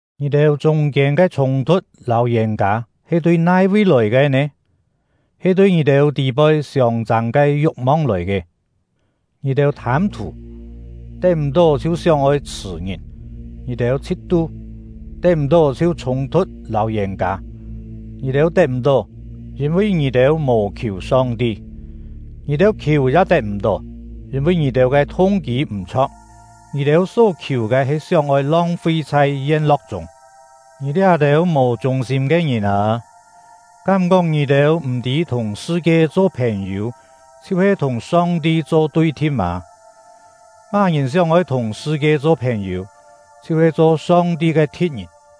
Ngì-têu chûng-kiên ke chhûng-thu̍t lâu yên-kâ he tui nai-vi lòi ke nè? He tui ngì-têu tî-poi siông-châng ke yu̍k-mong lòi ke! Ngì-têu thâm-thù, tet m̀-tó chhiu sióng-oi chhṳ̀ ngìn; ngì-têu chhit-tu, tet m̀-tó chhiu chhûng-thu̍t lâu yên-kâ. Ngì-têu tet m̀-tó, yîn-vi ngì-têu mò khiù Song-ti. Ngì-têu khiù ya tet m̀-tó, yîn-vi ngì-têu ke thung-kî m̀-chho̍k; ngì-têu só-khiù ke he sióng-oi long-fi chhai yen-lo̍k chûng. Ngì liá-têu mò chûng-sîm ke ngìn â! Kám-kóng ngì-têu m̀-tî thùng sṳ-kie cho phèn-yû chhiu-he thùng Song-ti cho tui-thi̍t mâ? Má-ngìn sióng-oi thùng sṳ-kie cho phèn-yû, chhiu-he cho Song-ti ke thi̍t-ngìn!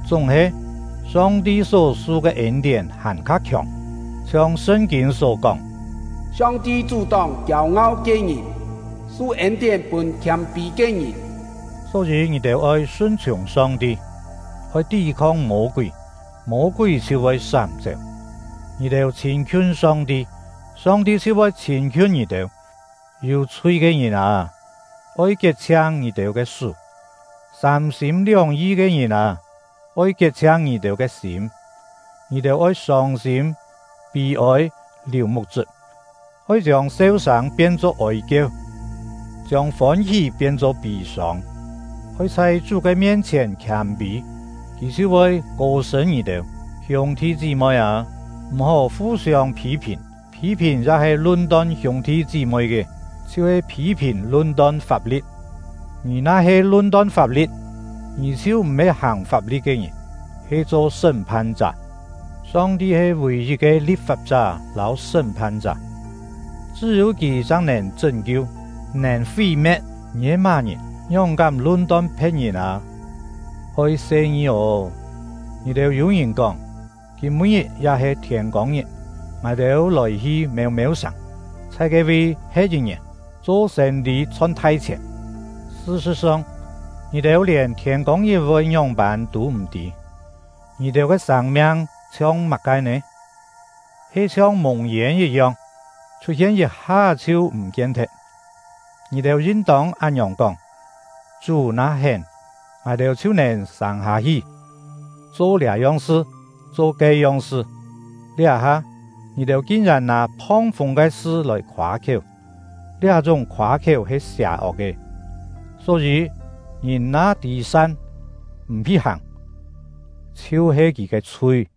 Chúng-he, Song-ti só su ke ên-tién hàn-kha khiòng, chhiong Sṳn-kîn só kóng: Song-ti chú-tóng kiêu-ngau ke ngìn, su ên-tién pûn khiâm-pî ke ngìn. Só-yî, ngì-têu oi sun-chhiùng Song-ti. Oi tí-khong Mô-kúi, Mô-kúi chhiu voi sám-chéu. Ngì-têu chhîn-khiun Song-ti, Song-ti chhiu voi chhîn-khiun ngì-têu. Yû-chhui ke ngìn â, oi kiet-chhiang ngì-têu ke sú! Sâm-sîm lióng-yi ke ngìn â, oi kiet-chhiang ngì-têu ke sîm! Ngì-têu oi sông-sîm, pî-ôi, liù muk-chṳp; oi chiông seu-sâng pien-cho ôi-kieu, chiông fôn-hí pien-cho pî-sông! Oi chhai Chú ke mien-chhièn khiâm-pî, Kì chhiu voi kô-sṳ̂n ngì-têu. Hiûng-thi chí-moi â, m̀-hó fu-siông phî-phìn. Phî-phìn ya-he lun-ton hiûng-thi chí-moi ke, chhiu-he phî-phìn, lun-ton fap-li̍t. Ngì na-he lun-ton fap-li̍t, ngì chhiu m̀-he hàng fap-li̍t ke ngìn, he cho sṳ́m-phan-chá. Song-ti he vì-yit ke li̍p-fap-chá lâu sṳ́m-phan-chá; chṳ́-yû Kì chang nèn chṳ́n-kiu, nèn fí-me̍t. Ngì he má-ngìn, ngióng-kám lun-ton phe̍t-ngìn â! Oi se-ngi ô! Ngì-têu yû-ngìn kóng: “Kîm-pû-ngit ya-he thiên-kông-ngit, ngài-têu lòi-hi mêu-mêu sàng, chhai ke-vi he̍t yit ngièn, cho sên-lî chhon thai-chhièn.” Sṳ-sṳ̍t-song, ngì-têu lièn thiên-kông-ngit voi ngióng-pân tû m̀ tî! Ngì-têu ke sâng-miang chhiong má-ke nè? He chhiong mùng-yên yit-yong, chhut-hien yit-ha-é chhiu m̀-kien-thet. Ngì-têu yin-tông án-ngiòng kóng: “Chú na hén, ngài-têu chhiu nèn sâng hâ-hi, cho liá-yong sṳ, cho ke-yong sṳ.” Liá-ha, ngì-têu kin-yèn nâ phong-fûng ke sṳ lòi khoâ-khiéu; liá-chúng khoâ-khiéu he sià-ok ke. Só-yî, ngìn na tî san, m̀ hi hàng, chhiu-he kì ke chhui.